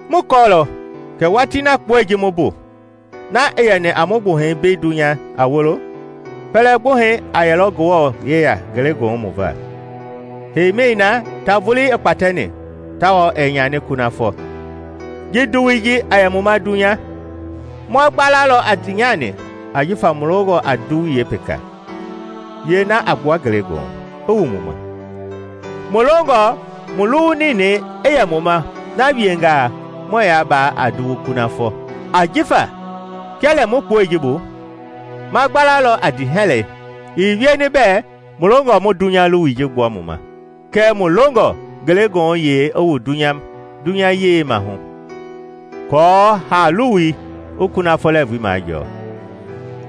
Mu kɔɔlɔ kɛ watii na kpoe ji mu mbu, na i yɛni a mu gbuhɛi mbei dunya a wolo, pɛlɛ gbuhɛi a yɛlɔ Ngewɔ yeya ngelegoohu mu va, heimi na ta vulii i kpatɛni tawao ɛɛ nyani kunafɔ. Ji nduwui ji a yɛ mu ma dunya, ma gbalalɔ a ndiinyani ajifa mu longɔ a nduwui yeepeka, yeena a gbua ngelegoohu, i wu mu ma. Mu longɔ mu luwu ninɛi i yɛ mu ma, na wiengaa, muɛɛ yaa baa a nduwu kunafɔ. Ajifa kia lɛ mu kpoe ji bu, ma gbalalɔ a ndiihɛlɛi; ii wieni bɛɛ mu longɔ mu dunya luwui ji gbua mu ma, kɛɛ mu longɔ ngelegoohuyei i wu dunyayei mahu aako haa-luwui i kunafɔ lɛɛvu majɔɔ.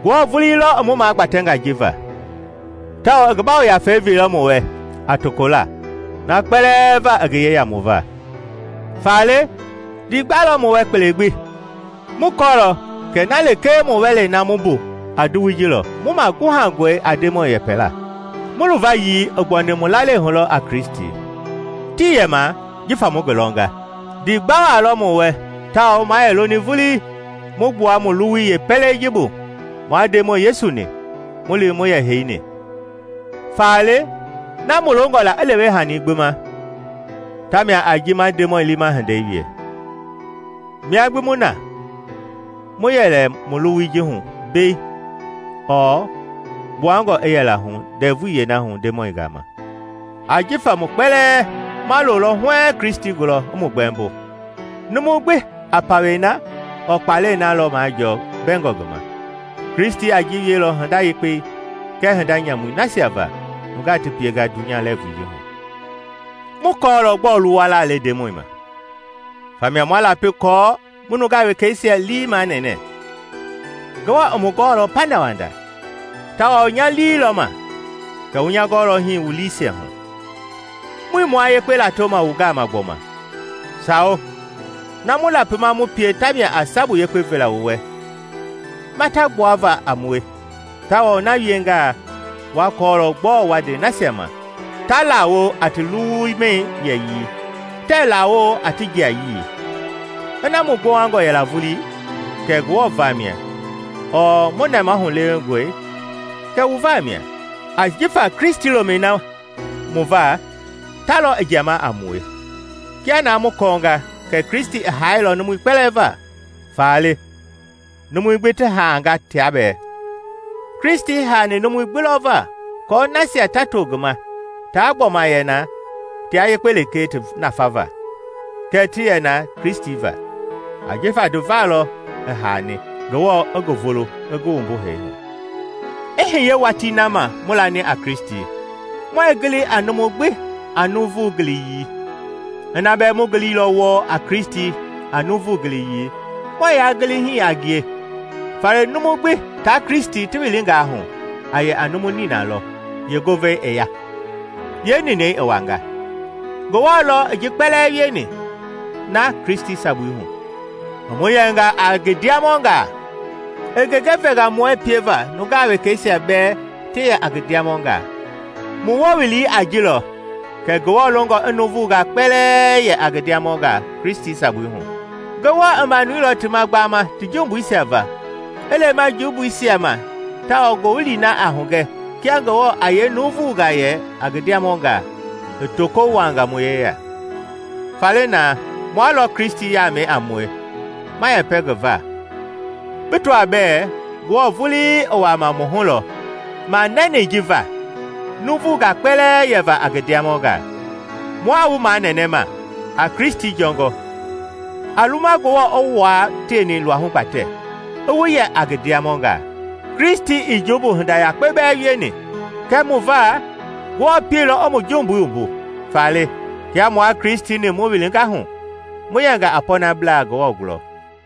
Ngewɔ vulii lɔ i mu magbatɛnga ji va, tawao i ngi Yafei veilɔ mu wɛ a tokola na kpɛlɛɛ va i ngi yeya mu va. Faale ndiigba lɔ mu wɛ kpele gbi. Mu kɔɔlɔ kɛ na lekee mu wɛlei na mu mbu a nduwui ji lɔ, mu maguhangɔe a Ndemɔi yeepɛla. Mu luvayii i gbuani mu lalei hu lɔ a Kristi, tii yɛma jifa mu ngi lɔnga. Ndiigba waa lɔ mu wɛ tawao ma yɛ loni vulii mu gbua mu luwui yeepɛlei ji bu mua Ndemɔi Yesu-ni mu li mu yɛ heini. Faale, na mu longɔ la i lewe hani gbi ma tamia a ji ma Ndemɔi liima hindei wie, mia gbi mu na, mu yɛ lɛ mu luwui ji hu mbei ɔɔ mu gbuangɔ i yɛla hu ndɛvui yeena hu Ndemɔi gama. Ajifa mu kpɛlɛɛ ma lolɔ huɛɛŋ Kristi gulɔ i mu gbɛmbo. Numu gbi a pawɛi na ɔɔ kpalɛi na lɔ majɔɔ mbɛngɔ ngi ma. Kristi a ji wielɔ hinda yekpei kɛɛ hinda nyamui nasia va nungaa ti pienga dunya lɛɛvui ji hu. Mu kɔɔlɔ gbɔɔ luwala le Ndemɔi ma, famia ma lapi kɔɔ mu nungaa wekeisia lii manɛɛ. Ngewɔ i mu gɔɔlɔ pandawanda, tawao nya lii lɔ ma kɛ wu nya gɔɔlɔ hi wu liisia hu. Muii mua yekpe latoma wu gama gbɔma. Sawo, na mu lapima mu pie tamia a sabu yekpe vela wu wɛ mata gbuava a mue; tawao na wiengaa wa kɔɔlɔ gbɔɔ wa nde nasia ma ta lawo a ti luwumɛi yɛyii, tɛɛ laawo a ti jiayii. Ina mu gbowangɔ yɛla vulii, kɛ Ngewɔ vamia; ɔɔ mu nɛmahu lewengɔi, kɛ wu vamia. Ajifa Kristi lomɛi na mu va ta lɔ i jiama a mue, kia na mu kɔɔnga kɛ Kristi i haailɔ numui kpɛlɛɛ va, faale numui gbi ti haanga tia bɛɛ. Kristi haani numui gbi lɔ va kɔɔ nasia ta to ngi ma taa gbɔma yɛ na tia yekpe lekee ti nafava, kɛɛ ti yɛ na Kristi va. Ajifa ti va lɔ i haani, Ngewɔ i ngi vulu i ngi wumbu hee hu. I hiye watii na ma mu lani a Kristi, muɛɛ gili a numu gbi a nuuvu giliyii. Ina bɛɛ mu giliilɔ wɔɔ a Kristi a nuuvu giliyii, muɛɛ yaa gili hii a ngie. Faale numu gbi taa Kristi ti wilingaa hu, a yɛ a numu nina lɔ; yeengovei i ya, yeeninɛi i wanga. Ngewɔ lɔ i ji kpɛlɛɛ wieni, na Kristi sabui hu, i mu yɛnga a ngi ndiamɔngaa, i genge venga mue pieva nungaa wekeisia bɛɛ ti yɛ a ngi ndiamɔngaa. Mu wowili a ji lɔ kɛ Ngewɔ longɔ i nuuvungaa kpɛlɛɛ yɛ a ngi ndiamɔngaa Kristi sabui hu. Ngewɔ i manuilɔ ti ma gbama ti jumbuisia va i lema yeejumbuisia ma tawao ngowili na a hugɛ kia Ngewɔ a yee nuuvungaa yɛ a ngi ndiamɔngaa, i toko wuaanga mu yeya. Faale na mua lɔ Kristi yaamɛi a mue ma yɛpɛ ngi va, bi tɔaa bɛɛ Ngewɔ vulii i wuama mu hu lɔ manɛnɛi ji va nuuvungaa kpɛlɛɛ yɛva a ngi ndiamɔnga. Mua wu manɛnɛma a Kristi jɔngɔ; a luma Ngewɔ i wua tieni luahu gbatɛ i wu yɛ a ngi ndiamɔnga. Kristi ii jumbu hinda yakpe bɛɛ wieni, kɛɛ mu va Ngewɔ pielɔ i mu jumbui wumbu. Faale, kia mua Kristi-ni mu wilinga hu, mu yɛnga a pɔɔnablaa Ngewɔ gulɔ.